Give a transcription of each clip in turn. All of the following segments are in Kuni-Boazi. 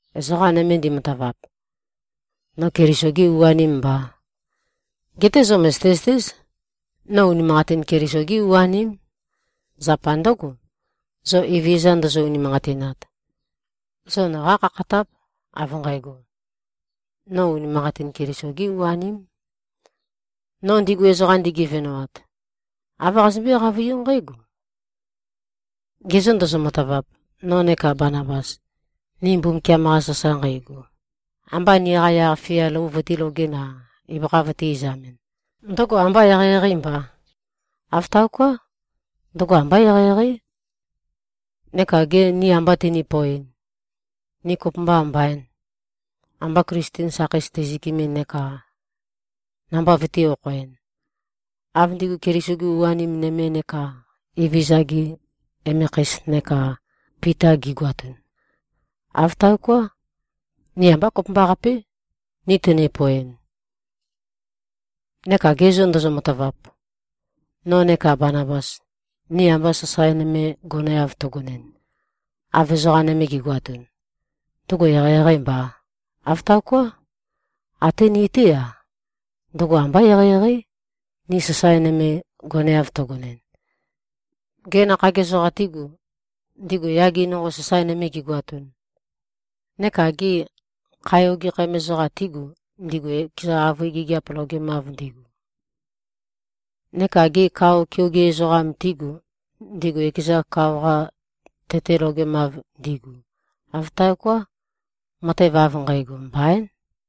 Ezoqa nøme ndimatavap, no Keliso-gē u-anēm mbā. Geté zo mø̀zøte-zøtéz, no unimanqatin Keliso-gé u-aném. Zapa ndǿgo, zo Evezøza ndozo-unimanqatinat, zo noqá khakhatáp, av nqægo, no unimanqatin Keliso-gé u-aném. No ndigu ezoqam, ndigevenoat, āv qazømbé-qavøiú nqǽgo: Ge zô, ndozo-matavap, no neka Banabas, ni Mbumbukiam-qa sasae nqeigu, amba niqa yaq-fia lou vøtīlogɨn-a, ibøkha vøtī-izamɨn, ndøgo ambâ eqeieqeî mbà? Āv taoká. Ndøgo ambá eqeieqeí. Neka gê, ni amba tøni-poeɨn, ni kopømba mbaîn, amba Klisten sakheis teizøkɨmɨn neka namba vøtī-okhoɨn, av ndigu Keliso-gi u-anim nøme neka Evezøza-gi emekheis neka Pita gi꞉goatun? Āv taoká. Ni ambá kopømbaqapé, ni tøni-poeɨn. Neka ge zô, ndozo-matavap, no neka Banabas, ni amba sasae nøme goneav teigonɨn, av ezoqa nøme gi꞉goatun, ndøgo eqeieqeî mbà? Āv taoká. Até ní-té-a, ndøgo ambá eqeieqeí, ni sasae nøme goneav teigonɨn. Gê, nakhag ezoqa tígu, ndigu yage nonqo, sasae nøme gigoatun? Neka gê, khae ogekhæm ezoqa tígu, ndigu ekeza avøe gigiap logemav ndigu? Neka gê, kao keoge ezoqa tígu, ndigu ekezan, kao-qa tete logemav ndigu? Āv taoká. Matev av nqægo, mbaín.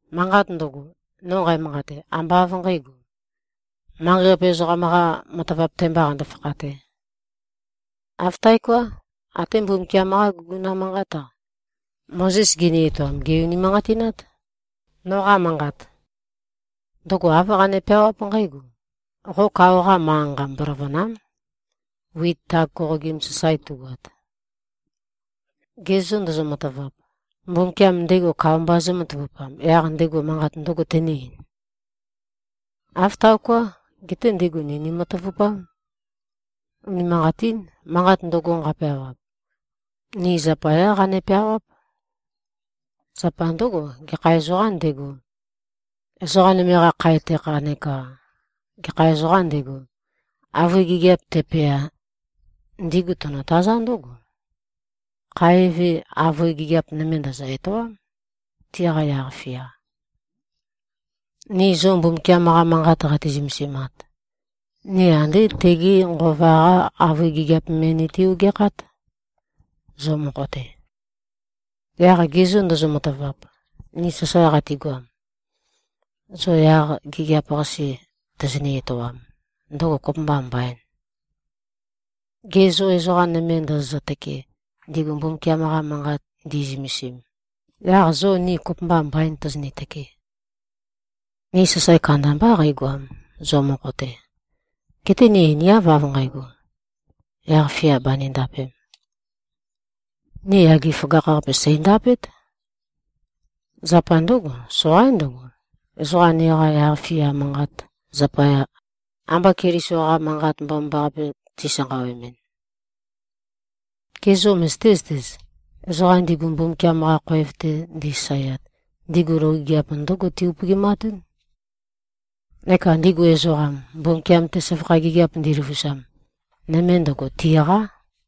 Manqat ndøgo, no nqæmanqate, ambá av nqǣgo, manqei-qape ezoqam-qā matavap-te mbā qando-fakhatē. Āv taoká. Até Mbumbukiam-qá guguna manqát-a, Mozes gini-etoam, gè-unimanqatinát, noqa manqat. Ndøgo āv qane-peawáp nqǽgo, “Qo kao-qa manqa-nqa, mboløvø̀na᷄m, wit tag koqogim sasae tugoat.” Ge zô, ndozo-matavap, Mbumbukiam ndego kao mba zǿmatavupam, yaq ndego manqat ndø̄go tene-eīn? Āv taoká. Geté ndego ni nimatavupám. Unimanqatín. Manqat ndøgo, nqapeawap, ni zapayá qane-peawáp. Zapa ndǿgo, gekha ezoqām ndego, ezoqa nøme-qa khae tekha neka gekha ezoqām ndego, avøe gigiap tepea, ndigu tonotazá ndǿgo: Khae eve, avøe gigiap nøme ndø̀zø-etoám, tiqa yaq-fia. Ni zo Mbumbukiam-qa Manqat qati-zømesimat, ni andé tege Nqova-qá avøe gigiap me niti-ogeakhát, zo mokho-te. Yaq ge zô, ndozo-matavap, ni sasae qatigoam, zo yaq gigiap-qase tozoni-etoam, ndøgo kopømbâ mbaìn? Gê, zo ezoqa nøme ndozozø-tøkee, ndigu Mbumbukiam-qa Manqat ndi꞉zømesim, yaq zo ni kopømba mbaîn tozoni-tøke? Ni sasae kandambá qeigoam, zo mokho-te. Geté ni einiáv av nqægo, yaq-fia bànindapēm. Ni yage føgakh-qape sèindapét. Zapa ndǿgo, soqaín ndøgo, ezoqa niqa yaq-fia manqat zapaya, amba Keliso-qa Manqat Mbomambaqape tisanqawemɨn. Ge zô, møzøté-zøtez? Ezoqam ndigu Mbumbukiam-qa khoev-te ndisasaeat, ndigu loge gigiap ndǿgo ti-upøgimatún. Neka ndigu ezoqam, Mbumbukiam-te søvakha gigiap ndiløvusam, nøme ndøgo, tiqá.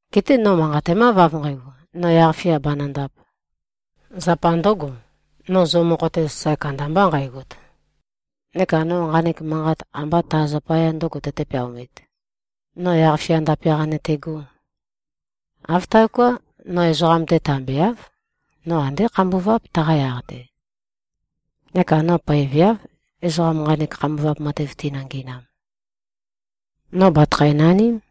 Geté no manqatemáv av nqægo, no yaq-fia bànøndāp, zapa ndø̄go, no zo mokho-te sasae kandambā nqægot. Neka no nqanek manqat ambá ta zapaya ndø̄go tøte-peaomīt, no yaq-fia ndape-qa nøtegō. Āv taoká. No ezoqam-te tambeáv. No andé khambuváp, taqa yaq-te. Neka no poeveáv, ezoqa nqanek khambuvap matev tinø-ngi꞉nam. No bàtøkhæ-naním.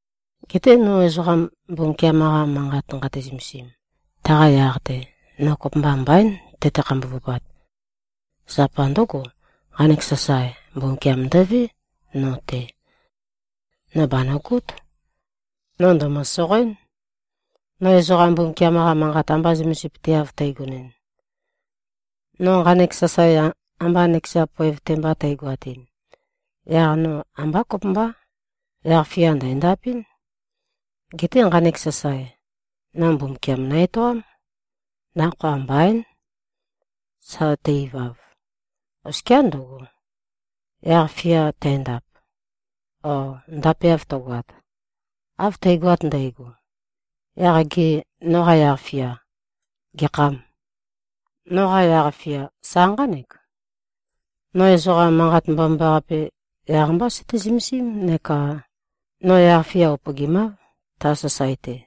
Geté no ezoqa Mbumbukiam-qa Manqat nqate-zømesim, taqa yaq-te, no kopømba mbaín, tøte-khambuvupat. Zapa ndǿgo, nqanek sasae, Mbumbukiam ndøvé, no-te. No bànøgót. No ndæ̀mø-soqoenɨ́n, no ezoqa Mbumbukiam-qa Manqat amba zømesipøteav tægonɨn. No nqanek sasae amba nøkeza poev-te mba tægoatɨn, yaq no ambá kopømbá. Yaq-fia ndæ̀ndapɨ́n. Geté nqanek sasae, no Mbumbukiam nø-etoám. Nakhoa mbaín, sa tæ-ivav. Oskiá ndøgo, yaq-fia tændap o ndapeav tøgoat. Av tægoat ndægo, yaq gê, noqa yaq-fia gekhâm? Noqa yaq-fia sa nqánek: No ezoqa Manqat Mbomambaqape, yaq-mbá søté-zømesím neka no yaq-fia upøgimáv, ta sasae-te.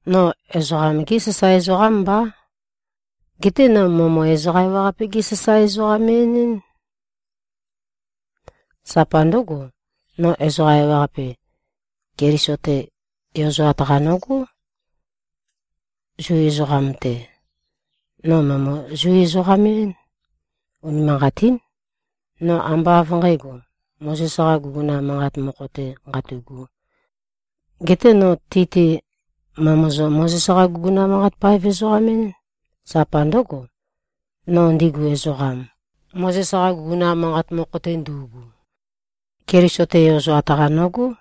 No ezoqam-gé sasae ezoqám mbá. Geté no mø̀emø-ezoqa-ewaqape-gé-sasae-ezoqam-en-ɨ́n. Zapa ndǿgo, no ezoqa ewaqape, Keliso-te yozoat-qa nogó. Zu ezoqam-te, no mø̀emø-Zu-ezoqam-én. Unimanqatín. No ambá av nqǣgo, Mozes-qā guguna manqat mokho-tē qatu꞉gū. Geté no ti-te mø̀emøzø-Mozes-qa-guguna-manqat-paev-ezoqam-én. Zapa ndǿgo, no ndigu ezoqam, Mozes-qa guguna manqat mokho-te ndu꞉gu, Keliso-te yozoat-qa nogó.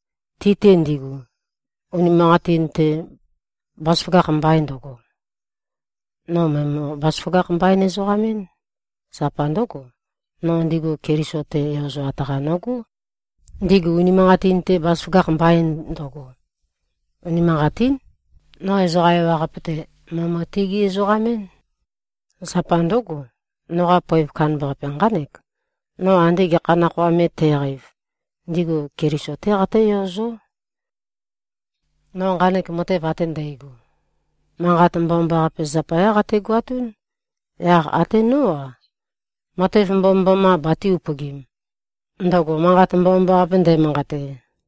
Ti-te ndigu, unimanqatin-te bazaføgakh mbain ndøgo, no mø̀emø-bazaføgakh-mbain-ezoqam-én. Zapa ndǿgo, no ndigu Keliso-te yozoat-qa nogó, ndigu unimanqatin-te bazaføgakh mbain ndøgo. Unimanqatín. No ezoqa ewaqape-te, mø̀emø-tigí-ezoqam-én. Zapa ndǿgo, noqa poev kandambaqape nqánek: No ande gekha nakhoa me tæqeiv, ndigu Keliso-té qatǿyozó. No nqanek matev ate ndægo, Manqat Mbomambaqape zapayá qategoatún. Yaq até nó-a, matev mbomømboma batē-upøgim, ndøgo Manqat Mbomambaqape ndæmanqate.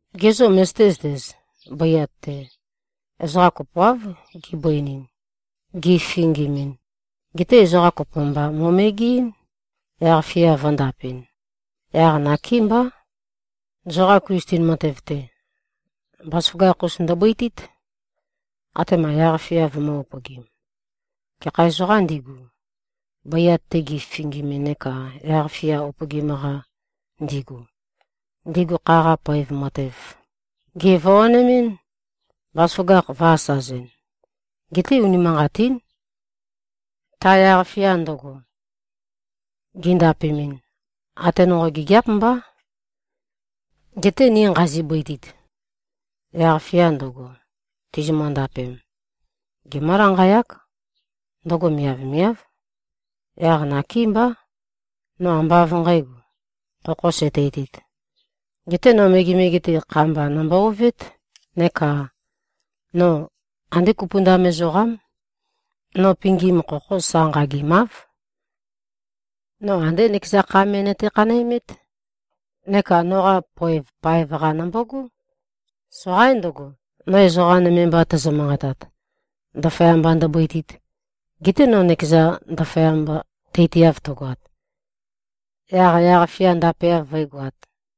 Ge zô, møzøté-zøtez? Bøiat-te, ezoqa kopoáv gibøinin, gififingimin. Geté ezoqa kopo mba mo꞉megeɨ́n, yaq-fia vø̄ndapɨn. Yaq nakémbá. Zoqa Klisten matev-te, bazaføgakh-us ndøbøitít, atema yaq-fia vømø̄-upøgim. Gekha ezoqām ndigu, bøiat-te gififingimin neka yaq-fia upøgim-qa ndigu, ndigu kha-qa poev matev gèvoanemɨ́n, bazaføgakh vø̄-asazɨn. Geté unimanqatín. Ta yaq-fia ndøgo, gindapemɨn, ate nonqo gigiáp mbá. Geté ni nqazi-bøitit, yaq-fia ndøgo tizimø-ndapem, gemǿ-lanqayák. Ndøgo miavmiáv. Yaq nakémbá, no ambá av nqǣgo, khokho sæteitīt. Geté no megemege-te, kha-mba nombo-ovét. Neka no andé kupundam ezoqám. No pingim khokho sa nqagimáv. No andé nøkeza kha me nøte-khanæmét, neka noqa poev paev-qa nombogó. Soqaín ndøgo, no ezoqa nøme mba tæzø-manqatat, ndaføyamba ndøbøitīt, gete no nøkezan ndaføyamba teitiav tøgoat, yaq yaq-fia ndapeav vǿegoāt.